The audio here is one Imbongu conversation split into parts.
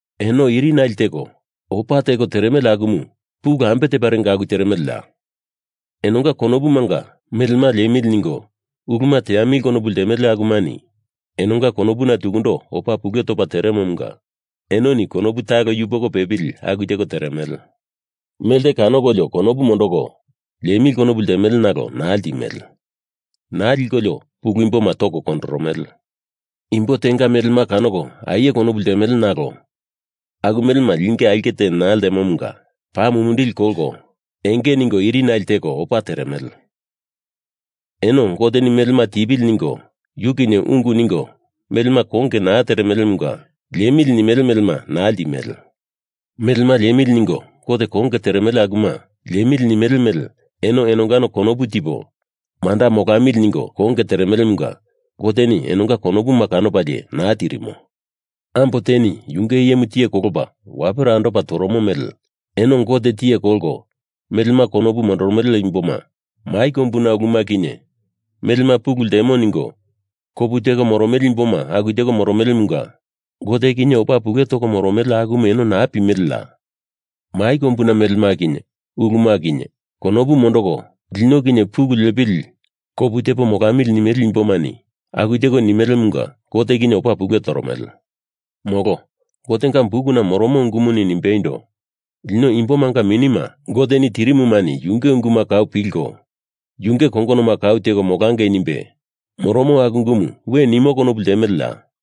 Eno irinale teko opa teko teremele akumu pulu ambe teparenga aku teremeleya? Enonga konopumanga melema liemili ningo uluma teamili konopu ltemele ulu akumani enonga konopuna tukundo opa pule topa teremomunga enoni konopu talo yupoko pepili aku teko teremele. Melte kanokolio konopu mondoko liemili konopu ltemele nalo naa ltimele. Naa likolio pulu imboma toko kondoromele. Imbo tenga melema kanoko aie konopu ltemele nalo aku melema linge aulke te naa ltemomunga paa mumindili kolko enge ningo irinale teko opa teremele. Eno Goteni melema tipili ningo yu kinye ungu ningo melema konge naa teremelemunga liemili nimele melema naa ltimele. Melema liemili ningo Gote konge teremele akuma liemili nimele mele eno enongano konopu tipo manda molamili ningo konge teremelemunga Goteni enonga konopuma kanopalie naa tirimo. Ambo teni yunge iyemu tiye kolopa wapera andopa toromo mele eno Gote tiye kolko melema konopu mondoromele imboma, mai kombuna uluma kinye melema pulu ltemo ningo kopu teko moromele imboma aku teko moromelemunga Gote kinye opa pule toko moromele, akumu eno naa pimeleya? Mai kombuna melema kinye uluma kinye konopu mondoko lino kinye pulu liepili kopu tepo molamili nimele imbomani aku teko nimelemunga Gote kinye opa pule toromele. Molo Gotenga bukuna moromo ungumuni nimbeindo, lino imbomanga minima Goteni tirimumani Yunge unguma kau pilko, yunge kongonoma kau teko molangei nimbe moromo aku ungumu we nimo konopu ltemeleya?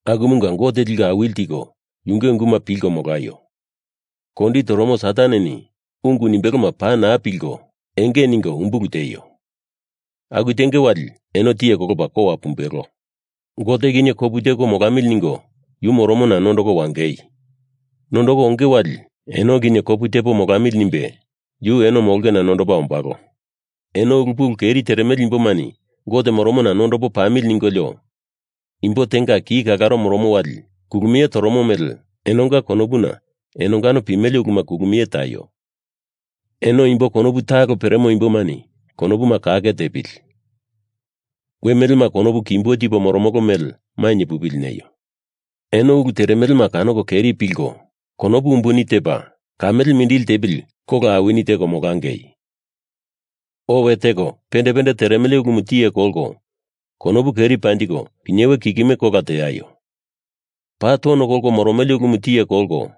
Akumunga Gote liko awili tiko yunge unguma pilko molaio. Kondi toromo Sataneni ungu nimbeloma paa naa pilko enge ningo umbulu tieio. Aku tenge wali eno tiye kolopa kowa pumbelo. Gote kinye kopu tepo molamili ningo yu moromona nondoko wangei. Nondoko onge wali eno kinye kopu tepo molamili nimbe yu eno molongena nondopa ombalo. Eno ulu pulu keri teremele imbomani Gote moromona nondopo pamili ningolio imbo tenga ki kalaro moromo wali kulumie toromo mele enonga konopuna enongano pimele uluma kulumie taio. Eno imbo konopu talo peremo imbomani konopuma kake tepili. We melema konopu kimbo tipo moromolo mele mainye pupili neio. Eno ulu teremelema kanoko keri pilko, konopu umbuni tepa kamele mindili tepili kola awini teko molangei. Owe teko pende pende teremele ulumu tiye kolko konopu keri panjiko pinyewe kikime kola teaio. Paa tono kolko moromele ulumu tiye kolko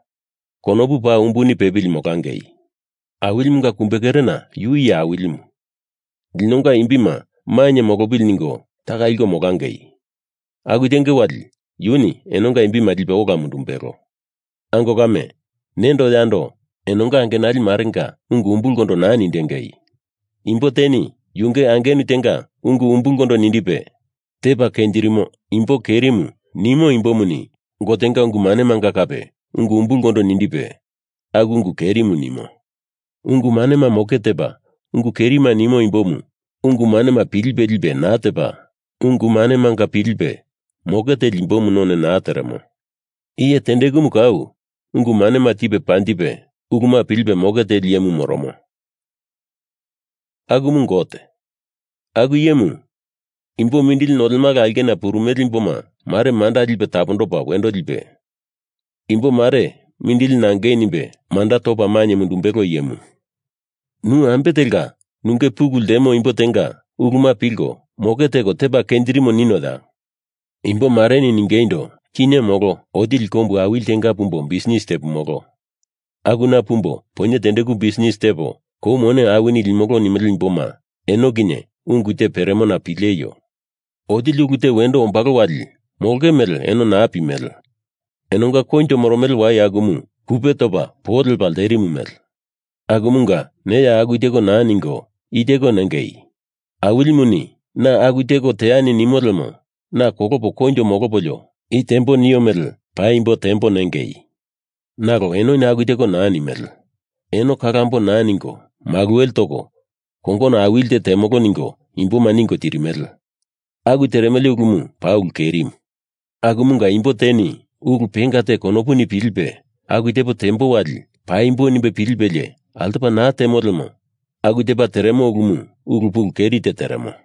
konopu paa umbuni pepili molangei. Awilimunga kumbekerena yu iye awilimu, linonga imbima mainye molopili ningo taka liko molangei. Aku tenge wali yuni enonga imbima lipe ola mundumbelo. Ango kame, nendo yando enonga angenali marenga ungu umbulkondo naa nindengei. Imbo teni yunge angenu tenga ungu umbulkondo nindipe, tepa kenjirimo imbo kerimu nimo imbomuni Gotenga ungu manemanga kape ungu umbulkondo nindipe, aku ungu kerimu nimo. Ungu manema moke tepa ungu kerimu nimo imbomu ungu manema pilipe lipe naa tepa, ungu manemanga pilipe moke teli imbomu none teremo. Iye tendekumu kau ungu manema tipe panjipe, uluma pilipe moke teli iyemu moromo, akumu Gote. Aku iyemu imbo mindili nolemala aulkena purumele imbo mare manda lipe tapondopa wendo lipe, imbo mare mindili nangei nimbe manda topa mainye mundumbelo iyemu. Nu ambe telka nunge pulu ltemo imbo tenga uluma pilko moke teko tepa kenjirimo ninoya? Imbo mareni ningeindo, kinye molo otili kombu awili tenga pumbo bisnis tepumolo. Akuna pumbo poinye tendeku bisnis tepo kou mone awini limolo nimele imboma eno kinye ungu te peremona pileio. Otili ulu te wendo ombalo wali molonge mele eno naa pimele. Enonga koinjo moromele wai akumu kupe topa po lepa lterimu mele. Akumunga neya aku teko naa ningo, i teko nengei: Awilimuni na aku teko teani nimo lemo naa kolopo koinjo molopolio i teambo nio mele paimbo tembo nengei. Nalo enoni aku teko naa nimele. Eno kalambo naa ningo maluwele toko kongono awili te temolo ningo imboma ningo tirimele. Aku teremele ulumu paa ulu kerimu. Akumunga imbo teni ulu penga te konopuni pilipe aku tepo tembo wali paimbo nimbe pilipelie altopa naa temo lemo aku tepa teremo ulumu ulu pulu keri te teremo.